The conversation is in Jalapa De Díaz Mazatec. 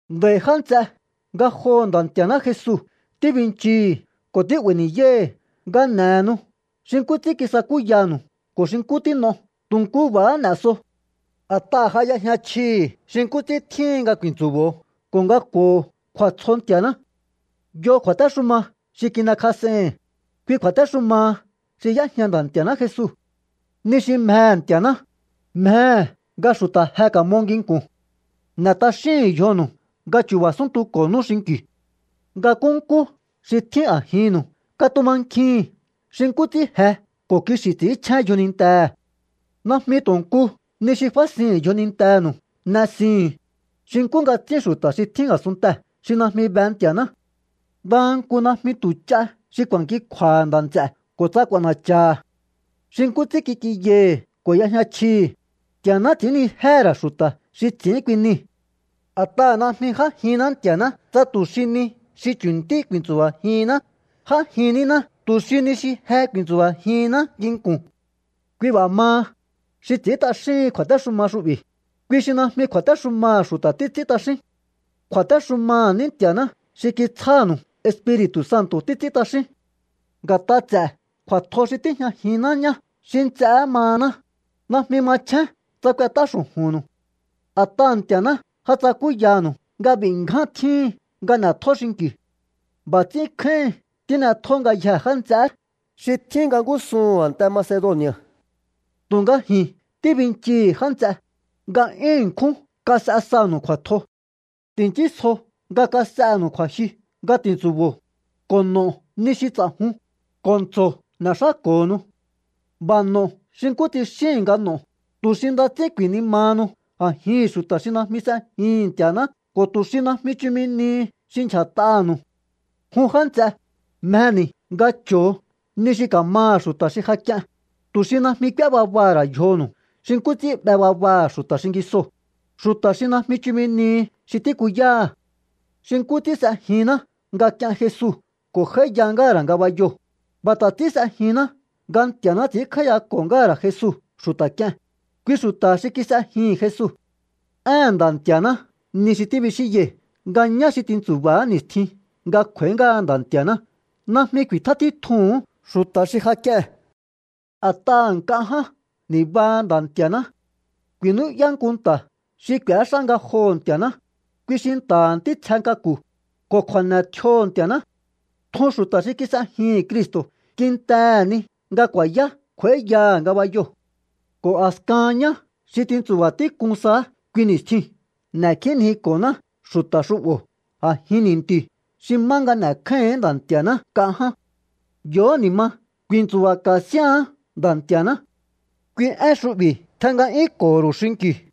Nd'a̱i̱ já nts'e, ngajoho̱ Nda̱ Nti̱a̱ná Jesu tíbinchii̱hi̱ ko̱ tí'ba̱i̱ ni̱yái̱hi̱ nga n'e̱henu xi nkú ts'ín kisakúyanu̱u ko̱ xi nkú tín'o tu̱ nkú b'a̱há n'e̱ so. A̱t'aha̱ ja y'ejña chjii̱hi̱ xi nkú ts'ín tjíhin nga ku̱i̱ntsu̱bo̱o ko̱ nga k'u̱o̱ho̱o kju̱a̱tsjo Nti̱a̱ná. Yo kju̱a̱téxuma xi kin'ekjas'ei̱hi̱n, kui kju̱a̱téxumaha xi y'éjña Nda̱ Nti̱a̱ná Jesu. Ni xi mjehe̱ Nti̱a̱ná, mjehe̱ nga xu̱ta̱ je ka̱mo nginku̱n. N'e̱ t'axíhu̱un yjonu̱u nga chu̱ba̱ súntuko̱nú xinki̱u. Nga nkúnkú xi tjín a̱jinnu̱u katumankjihi̱n xi nkú ts'ín je ko̱ kixi̱ ts'i̱ínchjén yjonintehe̱. Najmi tu̱ nku ni xi fásihi̱n yjonintenu̱u n'esihu̱un, xi nkú nga ts'ín xu̱ta̱ xi tjín a̱sunntee̱ xi najmi be Nti̱a̱ná. Ndaha nku najmi tu̱ ch'a xi ku̱a̱nkikju̱a̱ha̱ nda̱ nts'e̱ ko̱ tsa k'u̱a̱na̱cha̱ha̱. Xi nkú ts'ín kik'inyai̱hi̱ ko̱ y'ejña chjii̱hi̱, Nti̱a̱ná ts'i̱ínnijéhe̱ ra̱ xu̱ta̱ xi ts'i̱ín kui nii̱. A̱t'aha̱ najmi j'ájinná Nti̱a̱ná tsa tu̱ xi ni xi chu̱ntí ku̱i̱ntsu̱ba̱jihinná. J'ájin níná tu̱ xi ni xi je ku̱i̱ntsu̱ba̱jihinná nginku̱n. Kui b'a̱ maha, xi ts'i̱ín t'axíhin kju̱a̱téxuma xu'bi̱, kui xi najmi ku̱a̱téxumaha̱ xu̱ta̱ títs'ín t'axín. Kju̱a̱téxumaha̱ ní Nti̱a̱ná xi kitsjánu̱u Espiri̱tu̱ Santo̱ títs'ín t'axín. Nga̱t'a ts'e̱ kju̱a̱tjo xi tíjñajinná ñá xi nts'eé mahaná, najmi machjén tsa k'uet'á xu̱ju̱nnu̱u. A̱t'aha̱ Nti̱a̱ná ja tsakúyanu̱u nga b'i̱ ngján tjíhin nga n'e̱tjó xinki̱u. B'a̱ ts'ín kjáíhin tín'etjó ngayjee̱ já nts'eé xi tjín nga ngúsuhu̱n a̱nte Macedoni̱a̱. Tu̱nga ji̱n tíbinchii̱hi̱, já nts'e, nga 'yún ṉkjún kas'e sanu̱u kju̱a̱tjo. Ti̱nchísjo nga kas'enu̱u ku̱a̱jyu nga ti̱ntsu̱bo̱o, ko̱ n'o̱o ni xi ts'a̱jun, ko̱ ntso̱o n'e̱xáko̱honu. B'a̱ n'o̱ xi nkú tsixíi̱n nga n'o̱o, tu̱ xi nda ts'ín ku̱i̱nimahanu a̱jihi̱n xu̱ta̱ xi najmi s'ejihi̱n Nti̱a̱ná ko̱ tu̱ xi najmi chumi nihi xi ndyja̱t'aha̱nu̱u. Jun já nts'e, mjeni̱ nga cho̱o ni xi ka̱maha̱ xu̱ta̱ xi ja k'ien, tu̱ xi najmi k'úé babaha̱ ra̱ yjonu̱u xi nkú ts'ín 'be babaha̱ xu̱ta̱ xingisoo̱, xu̱ta̱ xi najmi chumi nihi xi tíkuyáha̱. Xi nkú ts'ín s'ejinná nga k'ien Jesu ko̱ j'áíya ngáha̱ ra̱ ngabayoo̱, b'a̱ ta̱ ts'ín s'ejinná nga Nti̱a̱ná ts'i̱ínkj'áíyako̱ ngáha̱ ra̱ Jesu xu̱ta̱ k'ie̱n, kui xu̱ta̱ xi kis'ejihi̱n Jesu. Éhe̱n Nda̱ Nti̱a̱ná ni xi tíbixínyai̱ nga ñá xi tintsu̱ba̱á ni̱stjin nga kj'u̱a̱í ngáha Nda̱ Nti̱a̱ná najmi ku̱i̱tjá títjuhu̱ún xu̱ta̱ xi ja k'ie̱n. A̱t'aha̱ nk'a ján ni̱baha Nda̱ Nti̱a̱ná. Ku̱i̱nú'yá nku nta̱ xi k'u̱éxá ngajoho̱ Nti̱a̱ná, kui xi nta̱ha̱ ntítsje k'aku̱, ko̱ kju̱a̱ne̱ tjioho̱ Nti̱a̱ná. Tjun xu̱ta̱ xi kis'ejihi̱n Cristo̱ kintehe̱ ni nga ku̱a̱yá kj'u̱a̱íyaha̱ ngabayo. Ko̱ a̱skahan ñá xi tintsu̱ba̱ tík'un saá kui ni̱stjiu̱n n'e̱kjínjiko̱ná xu̱ta̱ xu'bo̱ a̱jin ni̱nti̱u̱ xi má nga n'e̱kjáíhi̱ín Nda̱ Nti̱a̱ná nk'a ján. Yo̱hó ni̱ ma ku̱i̱ntsu̱ba̱ka̱ síha̱án Nda̱ Nti̱a̱ná. Kui én xu'bi̱ tjen nga'yúnko̱ho̱ ru̱u xinki̱u.